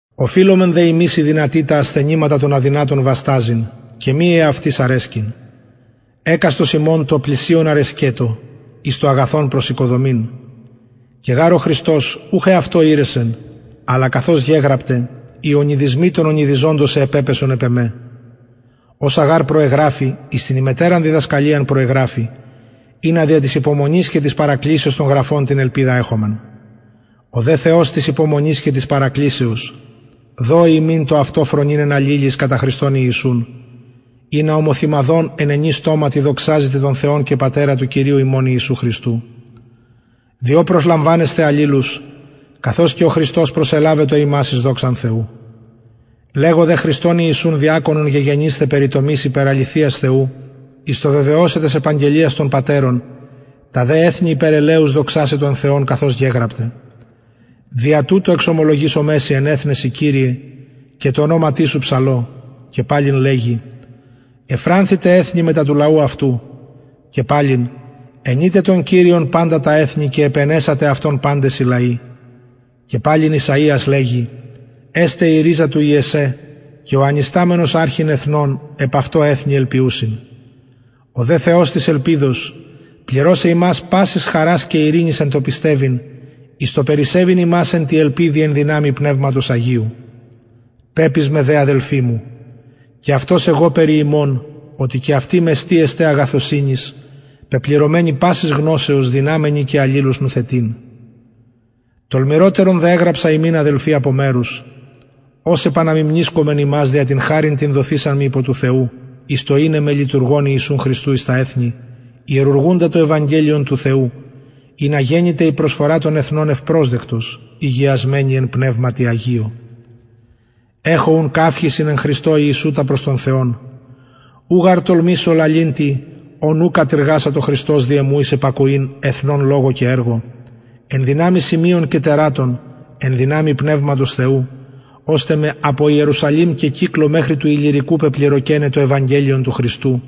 οφειλομεν δε ημεις οι δυνατοι τα ασθενηματα των αδυνατων βασταζειν και μη εαυτοις αρεσκειν εκαστος ημων τω πλησιον αρεσκετω εις το αγαθον προς οικοδομην και γαρ ο χριστος ουχ εαυτω ηρεσεν αλλα καθως γεγραπται οι ονειδισμοι των ονειδιζοντων σε επεπεσον επ εμε οσα γαρ προεγραφη εις την ημετεραν διδασκαλιαν προεγραφη ινα δια της υπομονης και δια της παρακλησεως των γραφων την ελπιδα εχωμεν ο δε θεος της υπομονης και της παρακλησεως δωη υμιν το αυτο φρονειν εν αλληλοις κατα χριστον ιησουν ινα ομοθυμαδον εν ενι στοματι δοξαζητε τον θεον και πατερα του κυριου ημων ιησου χριστου διο προσλαμβανεσθε αλληλους καθως και ο χριστος προσελαβετο υμας εις δοξαν θεου λεγω δε χριστον ιησουν διακονον γεγενησθαι περιτομης υπερ αληθειας θεου εις το βεβαιωσαι τας επαγγελιας των πατερων τα δε εθνη υπερ ελεους δοξασαι τον θεον καθως γεγραπται δια τουτο εξομολογησομαι σοι εν εθνεσιν και τω ονοματι σου ψαλω και παλιν λεγει ευφρανθητε εθνη μετα του λαου αυτου και παλιν αινειτε τον κυριον παντα τα εθνη και επαινεσατε αυτον παντες οι λαοι και παλιν ησαιας λεγει εσται η ριζα του ιεσσαι και ο ανισταμενος αρχειν εθνων επ αυτω εθνη ελπιουσιν ο δε θεος της ελπιδος πληρωσαι υμας πασης χαρας και ειρηνης εν τω πιστευειν εις το περισσευειν υμας εν τη ελπιδι εν δυναμει πνευματος αγιου πεπεισμαι δε αδελφοι μου και αυτος εγω περι υμων οτι και αυτοι μεστοι εστε αγαθωσυνης πεπληρωμενοι πασης γνωσεως δυναμενοι και αλλους νουθετειν τολμηροτερον δε εγραψα υμιν αδελφοι απο μερους ως επαναμιμνησκων υμας δια την χαριν την δοθεισαν μοι υπο του θεου εις το ειναι με λειτουργον ιησου χριστου εις τα εθνη ιερουργουντα το ευαγγελιον του θεου ινα γενηται η προσφορα των εθνων ευπροσδεκτος ηγιασμενη εν πνευματι αγιω εχω ουν καυχησιν εν χριστω ιησου τα προς τον θεον ου γαρ τολμησω λαλειν τι ων ου κατειργασατο χριστος δι εμου εις υπακοην εθνων λογω και εργω εν δυναμει σημειων και τερατων εν δυναμει πνευματος θεου ωστε με απο ιερουσαλημ και κυκλω μεχρι του ιλλυρικου πεπληρωκεναι το ευαγγελιον του χριστου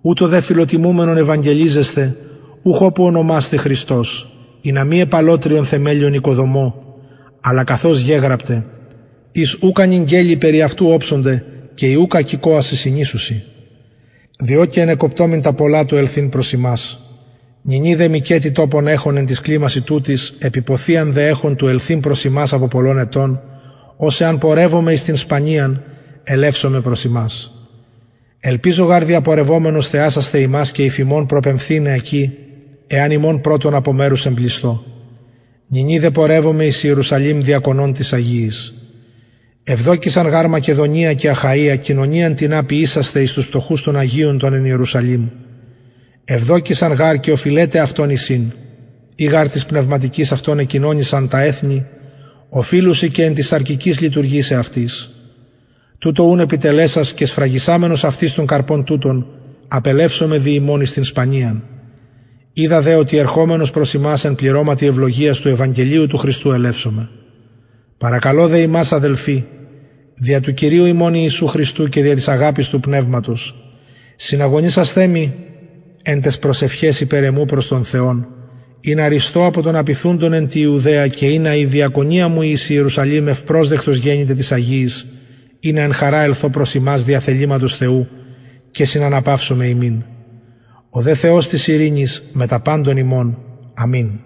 ουτως δε φιλοτιμουμενον ευαγγελιζεσθαι ουχ οπου ωνομασθη χριστος ινα μη επ αλλοτριον θεμελιον οικοδομω αλλα καθως γεγραπται οις ουκ ανηγγελη περι αυτου οψονται και οι ουκ ακηκοασιν συνησουσιν διο και ενεκοπτομην τα πολλα του ελθειν προς υμας νυνι δε μηκετι τοπον εχων εν τοις κλιμασιν τουτοις επιποθιαν δε εχων του ελθειν προς υμας απο πολλων ετων ως εαν πορευωμαι εις την σπανιαν ελευσομαι προς υμας ελπιζω γαρ διαπορευομενος θεασασθαι υμας και υφ υμων προπεμφθηναι εκει εαν υμων πρωτον απο μερους εμπλησθω νυνι δε πορευομαι εις ιερουσαλημ διακονων τοις αγιοις ευδοκησαν γαρ μακεδονια και αχαια κοινωνιαν τινα ποιησασθαι εις τους πτωχους των αγιων των εν ιερουσαλημ ευδοκησαν γαρ και οφειλεται αυτων εισιν ει γαρ τοις πνευματικοις αυτων εκοινωνησαν τα εθνη οφειλουσιν και εν τοις σαρκικοις λειτουργησαι αυτοις τουτο ουν επιτελεσας και σφραγισαμενος αυτοις τον καρπον τουτον απελευσομαι δι υμων εις την σπανιαν οιδα δε οτι ερχομενος προς υμας εν πληρωματι ευλογιας του ευαγγελιου του χριστου ελευσομαι παρακαλω δε υμας αδελφοι δια του κυριου ημων ιησου χριστου και δια της αγαπης του πνευματος συναγωνισασθαι μοι εν ταις προσευχαις υπερ εμου προς τον θεον ινα ρυσθω απο των απειθουντων εν τη ιουδαια και ινα η διακονια μου η εις ιερουσαλημ ευπροσδεκτος γενηται τοις αγιοις ινα εν χαρα ελθω προς υμας δια θεληματος θεου και συναναπαυσωμαι υμιν ο δε θεος της ειρηνης μετα παντων υμων αμην